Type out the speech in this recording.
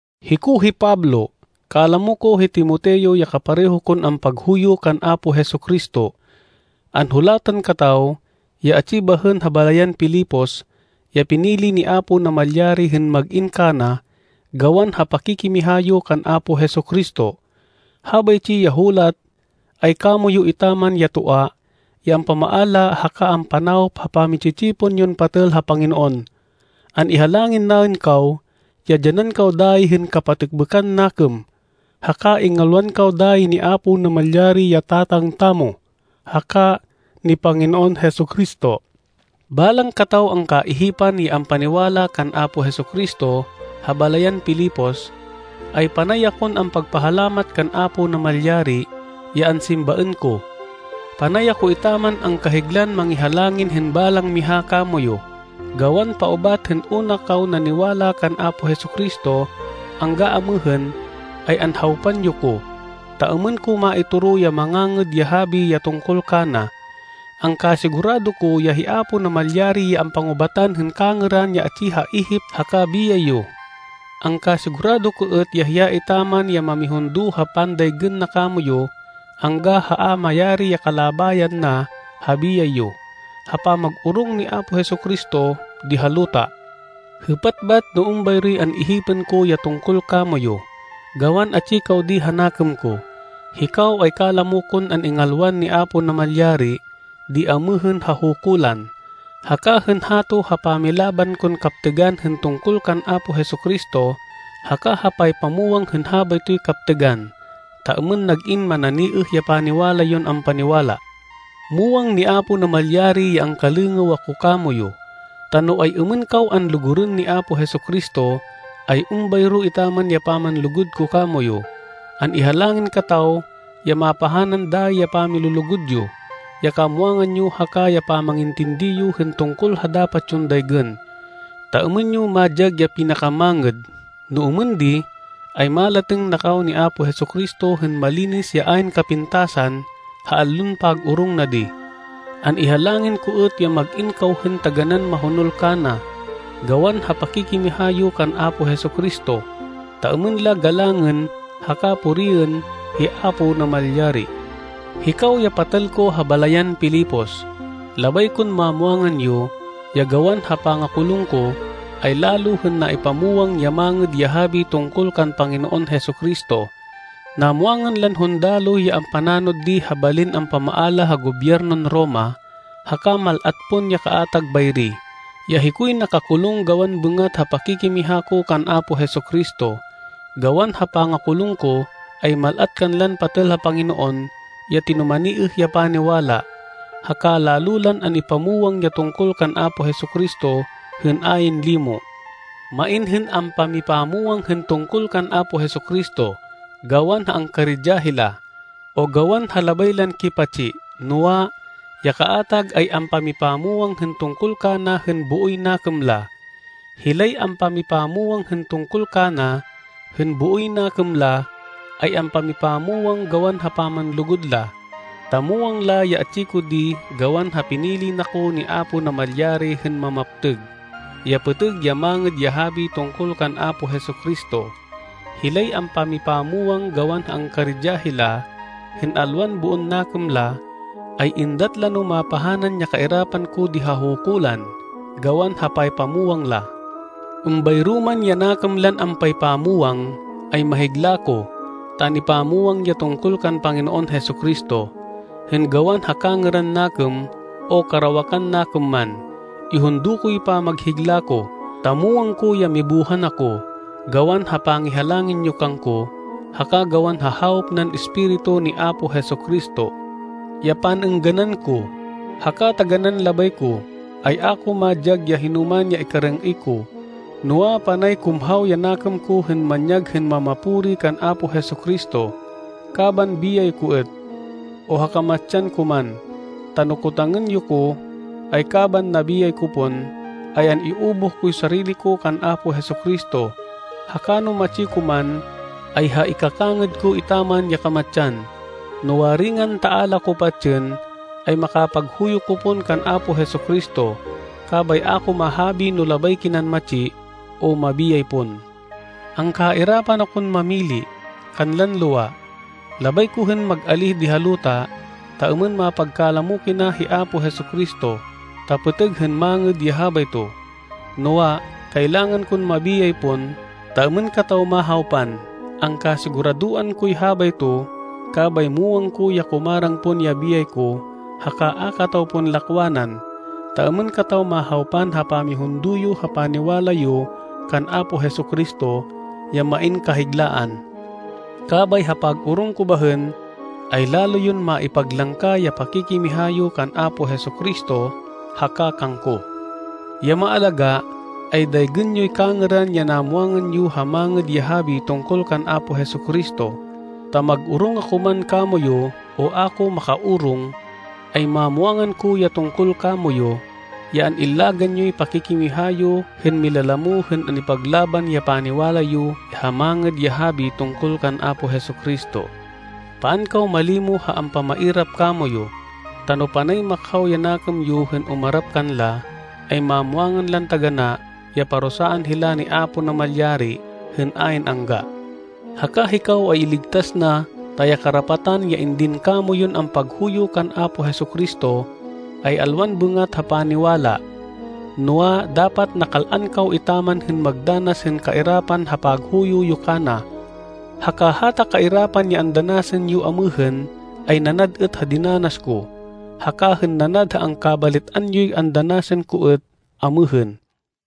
Hiko hi Pablo. Kalamo ko hi Timoteo ya kapareho kon ampaghuyo kan Apo Jesu-Cristo. Anhulatan kataw ya atsi bahên ha balayan Filipos ya pinili ni Apo Namalyari hên mag-in kana gawan ha pakikimiha yo kan Apo Jesu-Cristo. Habaytsi ya hulat ay kamoyu etaman ya toa ya ampamaala haka ampanawop ha pami-tsi-tsipon yon patêl ha Panginoon. An-ihalangin naên kaw ya dyanan kaw dayi hên kapatêkbêkan nakêm, haka ingalwan kaw dayi ni Apo Namalyari ya Tatang tamo, haka ni Panginoon Jesu-Cristo. Balang kataw angkaihipan ya ampaniwala kan Apo Jesu-Cristo ha balayan Filipos, ay panay akon ampagpahalamat kan Apo Namalyari, ya ansimbaên ko. Panay ako etaman angkahiglan mangihalangin hên balang miha kamoyu, gawan paubat hên una kaw naniwala kan Apo Jesu-Cristo, angga amêhên, ay anhawpan yo ko, ta êmên ko maitoro ya Mangangêd ya Habi ya tungkol kana. Angkasigurado ko ya hi Apo Namalyari ya ampangubatan hên kangêran ya atsi ha ihip haka biyay yo. Angkasigurado ko êt ya hiya etaman ya mamihundo ha pandaygên na kamoyu angga ha a mayari ya kalabayan na ha biyay yo, ha pamag-orong ni Apo Jesu-Cristo di ha luta. Hêpat bat no êmbayroy an-ihipên ko ya tungkol kamoyu, gawan atsi kaw di ha nakêm ko. Hikaw ay kalamo kon an-ingalwan ni Apo Namalyari di amêhên ha hukulan, haka hên hato ha pamilaban kon kaptêgan hên tungkol kan Apo Jesu-Cristo haka ha paypamwang hên habaytoy kaptêgan, ta êmên nag-in mananiêh ya paniwala yon ampaniwala. Muwang ni Apo Namalyari ya angkalêngêw ako kamoyu, ta no ay-êmên kaw anlugurên ni Apo Jesu-Cristo, ay êmbayro etaman ya pamanlugud ko kamoyu. An-ihalangin kataw ya mapahanan dayi ya pamilulugud yo, ya kamwangan yo haka ya pamangintindi yo hên tungkol ha dapat yon daygên, ta êmên yo madyag ya pinakamangêd. No êmên di, ay malatêng na kaw ni Apo Jesu-Cristo hên malinis ya ayn kapintasan ha allon pag-orong na di. An-ihalangin ko êt ya mag-in kaw hên taganán mahonol kana, gawan ha pakikimiha yo kan Apo Jesu-Cristo, ta êmên la galangên haka puriên hi Apo Namalyari. Hikaw ya patêl ko ha balayan Filipos, labay kon mamwangan yo, ya gawan ha pangakulung ko, ay lalo hên naipamwang ya Mangêd ya Habi tungkol kan Panginoon Jesu-Cristo. Namwangan lan hundaloh ya ampananod di ha balin ampamaala ha Gobyernon Roma, haka mal-at pon ya kaatag bayri, ya hikoy nakakulung gawan bêngat ha pakikimiha ko kan Apo Jesu-Cristo. Gawan ha pangakulung ko, ay mal-at kanlan patêl ha Panginoon ya tinumaniêh ya paniwala, haka lalo lan an-ipamwang ya tungkol kan Apo Jesu-Cristo hên ayn limo. Main hên ampamipamwang hên tungkol kan Apo Jesu-Cristo, gawan ha angkaridya hila, o gawan ha labay lan kipatsi. Noa, ya kaatag ay ampamipamwang hên tungkol kana hên booy nakêm la. Hilay ampamipamwang hên tungkol kana, hên booy nakêm la, ay ampamipamwang gawan ha pamanlugud la, ta muwang la ya atsi ko di gawan ha pinili na ko ni Apo Namalyari hên mamaptêg, ya pêtêg ya Mangêd ya Habi tungkol kan Apo Jesu-Cristo. Hilay ampamipamwang gawan ha angkaridya hila, hên alwan boon nakêm la, ay êndat la no mapahanan ya kairapan ko di ha hukulan, gawan ha paypamwang la. Êmbayro man ya nakêm lan ampaypamwang, ay mahigla ko, ta an-ipamwang ya tungkol kan Panginoon Jesu-Cristo, hên gawan ha kangêran nakêm, o karawakan nakêm man. Ihundo koy pamaghigla ko ta muwang ko ya mibuhan ako, gawan ha pangihalangin yo kangko, haka gawan ha hawop nan Espiritu ni Apo Jesu-Cristo. Ya pan-êngganan ko, haka taganán labay ko, ay a ko madyag ya hinoman ya ikarêng-êy ko, noa, panay kumhaw ya nakêm ko hên manyag hên mamapuri kan Apo Jesu-Cristo, kaban biyay ko êt, o ha kamatsan ko man. Ta no kotangên yo ko, ay kaban nabiyay ko pon, ay an-iubuh koy sarili ko kan Apo Jesu-Cristo, haka no matsi ko man, ay ha ikakangêd ko etaman ya kamatsan. No waringan ta a la ko patsên, ay makapaghuyo ko pon kan Apo Jesu-Cristo. Kabay a ko mahabi no labay kinan matsi, o mabiyay pon. Angkairapan akon mamili, kanlan lowa. Labay ko hên mag-alíh di ha luta, ta êmên mapagkalamo kina hi Apo Jesu-Cristo, ta pêtêg hên mangêd ya habayto. Noa, kailangan kon mabiyay pon, ta êmên kataw mahawpan. Angkasiguradoan koy habayto, kabay muwang ko ya kumarang pon ya biyay ko haka a kataw pon lakwanan, ta êmên kataw mahawpan ha pamihundo yo ha paniwala yo kan Apo Jesu-Cristo, ya main kahiglaan. Kabay ha pag-orong ko bahên, ay lalo yon maipaglangka ya pakikimiha yo kan Apo Jesu-Cristo haka kangko. Ya maalagá, ay daygên yoy kangêran ya namwangan yo ha Mangêd ya Habi tungkol kan Apo Jesu-Cristo, ta mag-orong ako man kamoyu, o a ko maka-orong, ay mamwangan ko ya tungkol kamoyu, ya an-illagan yoy pakikimiha yo hên milalamo hên an-ipaglaban ya paniwala yo ha Mangêd ya Habi tungkol kan Apo Jesu-Cristo. Paan kaw malimo ha ampamairap kamoyu, ta no panay makhaw ya nakêm yo hên umarap kanla, ay mamwangan lan taganá ya parusaan hila ni Apo Namalyari hên ayn angga, haka hikaw ay iligtas na ta ya karapatan ya indin kamoyun ampaghuyo kan Apo Jesu-Cristo, ay alwan bêngat ha paniwala, noa, dapat nakal-an kaw etaman hên magdanas hên kairapan ha paghuyo yo kana. Haka hata kairapan ya andanasan yo amêhên, ay nanad êt ha dinanas ko, haka hên nanad ha angkabalit-an yoy andanasan ko êt amêhên.